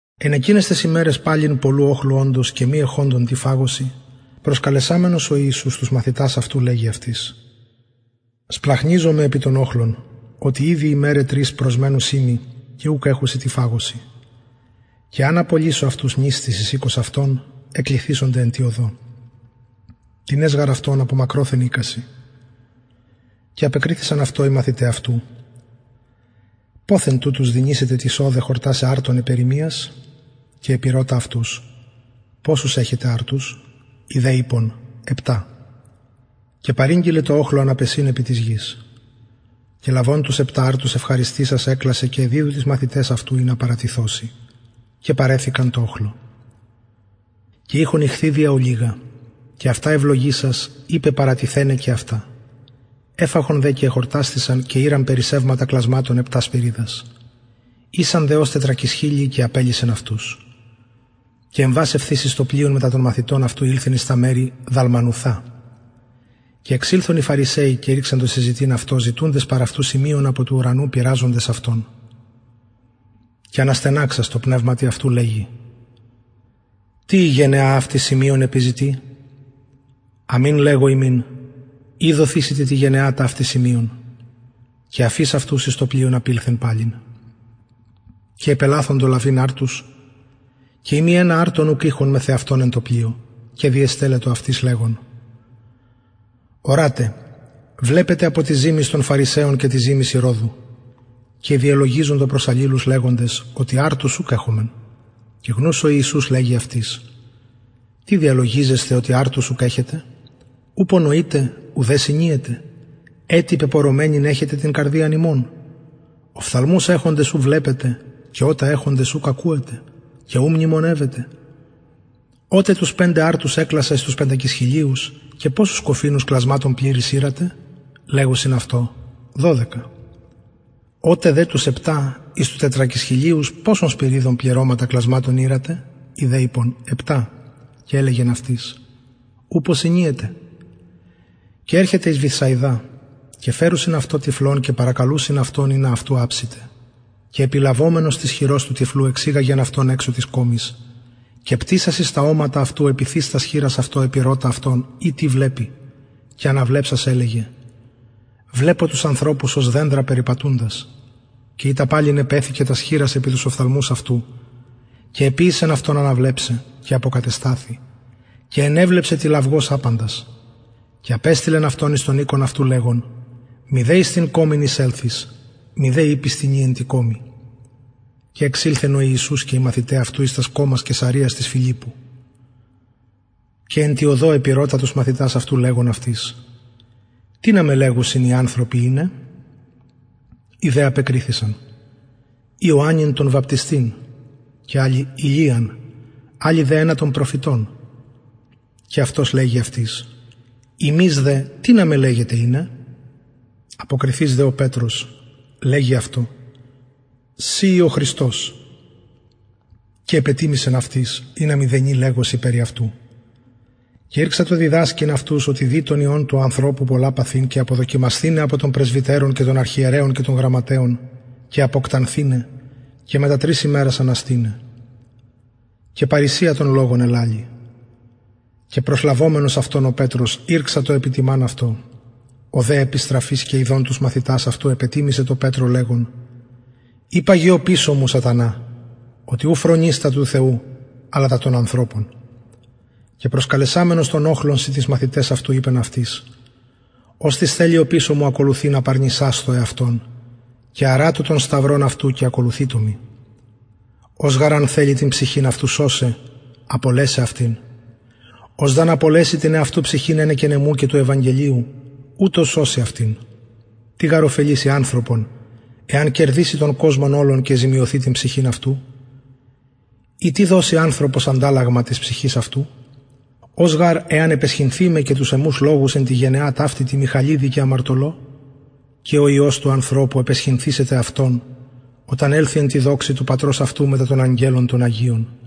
εν εκειναις ταις ημεραις παμπολλου οχλου οντος και μη εχοντων τι φαγωσιν προσκαλεσαμενος ο ιησους τους μαθητας αυτου λεγει αυτοις σπλαγχνιζομαι επι τον οχλον οτι ηδη ημεραι τρεις προσμενουσιν μοι και ουκ εχουσιν τι φαγωσιν και εαν απολυσω αυτους νηστεις εις οικον αυτων εκλυθησονται εν τη οδω τινες γαρ αυτων μακροθεν ηκουσιν και απεκριθησαν αυτω οι μαθηται αυτου ποθεν τουτους δυνησεται τις ωδε χορτασαι αρτων επ ερημιας και επηρωτα αυτους ποσους εχετε αρτους οι δε ειπον επτα και παρηγγειλεν τω οχλω αναπεσειν επι της γης και λαβων τους επτα αρτους ευχαριστησας εκλασεν και εδιδου τοις μαθηταις αυτου ινα παραθωσιν και παρεθηκαν τω οχλω και ειχον ιχθυδια ολιγα και ευλογησας ειπεν παραθειναι και αυτα εφαγον δε και εχορτασθησαν και ηραν περισσευματα κλασματων επτα σπυριδας ησαν δε οι φαγοντες ως τετρακισχιλιοι και απελυσεν αυτους και ευθεως εμβας εις το πλοιον μετα των μαθητων αυτου ηλθεν εις τα μερη δαλμανουθα και εξηλθον οι φαρισαιοι και ηρξαντο συζητειν αυτω ζητουντες παρ αυτου σημειον απο του ουρανου πειραζοντες αυτον και αναστεναξας τω πνευματι αυτου λεγει τι η γενεα αυτη σημειον επιζητει αμην λεγω υμιν ει δοθησεται τη γενεα ταυτη σημειον και αφεις αυτους εμβας παλιν εις πλοιον απηλθεν εις το περαν και επελαθοντο λαβειν αρτους και ει μη ενα αρτον ουκ ειχον μεθ εαυτων εν τω πλοιω και διεστελλετο αυτοις λεγων ορατε βλεπετε απο της ζυμης των φαρισαιων και της ζυμης ηρωδου και διελογιζοντο προς αλληλους λεγοντες οτι αρτους ουκ εχομεν και γνους ο ιησους λεγει αυτοις τι διαλογιζεσθε οτι αρτους ουκ εχετε ουπω νοειτε ουδε συνιετε ετι πεπωρωμενην εχετε την καρδιαν υμων οφθαλμους εχοντες ου βλεπετε και ωτα εχοντες ουκ ακουετε και ου μνημονευετε οτε τους πεντε αρτους εκλασα εις τους πεντακισχιλιους ποσους κοφινους πληρεις κλασματων ηρατε λεγουσιν αυτω δωδεκα οτε δε τους επτα εις τους τετρακισχιλιους ποσων σπυριδων πληρωματα κλασματων ηρατε οι δε ειπον επτα και ελεγεν αυτοις πως ου συνιετε και ερχεται εις βηθσαιδαν και φερουσιν αυτω τυφλον και παρακαλουσιν αυτον ινα αυτου αψηται και επιλαβομενος της χειρος του τυφλου εξηγαγεν αυτον εξω της κωμης και πτυσας εις τα ομματα αυτου επιθεις τας χειρας αυτω επηρωτα αυτον ει τι βλεπει και αναβλεψας ελεγεν βλεπω τους ανθρωπους οτι ως δενδρα ορω περιπατουντας ειτα παλιν επεθηκεν τας χειρας επι τους οφθαλμους αυτου και εποιησεν αυτον αναβλεψαι και αποκατεσταθη και ενεβλεψεν τηλαυγως απαντας και απεστειλεν αυτον εις τον οικον αυτου λεγων μηδε εις την κωμην εισελθης μηδε ειπης τινι εν τη κωμη και εξηλθεν ο ιησους και οι μαθηται αυτου εις τας κωμας καισαρειας της φιλιππου και εν τη οδω επηρωτα τους μαθητας αυτου λεγων αυτοις τινα με λεγουσιν οι ανθρωποι ειναι οι δε απεκριθησαν ιωαννην τον βαπτιστην και αλλοι ηλιαν αλλοι δε ενα των προφητων και αυτος λεγει αυτοις υμεις δε τινα με λεγετε ειναι αποκριθεις δε ο πετρος λεγει αυτω συ ει ο χριστος και επετιμησεν αυτοις ινα μηδενι λεγωσιν περι αυτου και ηρξατο διδασκειν αυτους οτι δει τον υιον του ανθρωπου πολλα παθειν και αποδοκιμασθηναι απο των πρεσβυτερων και των αρχιερεων και των γραμματεων και αποκτανθηναι και μετα τρεις ημερας αναστηναι και παρρησια τον λογον ελαλει και προσλαβομενος αυτον ο πετρος ηρξατο επιτιμαν αυτω ο δε επιστραφεις και ιδων τους μαθητας αυτου επετιμησεν τω πετρω λεγων υπαγε οπισω μου σατανα οτι ου φρονεις τα του θεου αλλα τα των ανθρωπων και προσκαλεσαμενος τον οχλον συν τοις μαθηταις αυτου ειπεν αυτοις οστις θελει οπισω μου ακολουθειν απαρνησασθω εαυτον και αρατω τον σταυρον αυτου και ακολουθειτω μοι ος γαρ αν θελη την ψυχην αυτου σωσαι απολεσει αυτην ος δ αν απολεση την εαυτου ψυχην ενεκεν εμου και του ευαγγελιου ουτος σωσει αυτην τι γαρ ωφελησει ανθρωπον εαν κερδηση τον κοσμον ολον και ζημιωθη την ψυχην αυτου η τι δωσει ανθρωπος ανταλλαγμα της ψυχης αυτου ος γαρ εαν επαισχυνθη με και τους εμους λογους εν τη γενεα ταυτη τη μοιχαλιδι και αμαρτωλω και ο υιος του ανθρωπου επαισχυνθησεται αυτον οταν ελθη εν τη δοξη του πατρος αυτου μετα των αγγελων των αγιων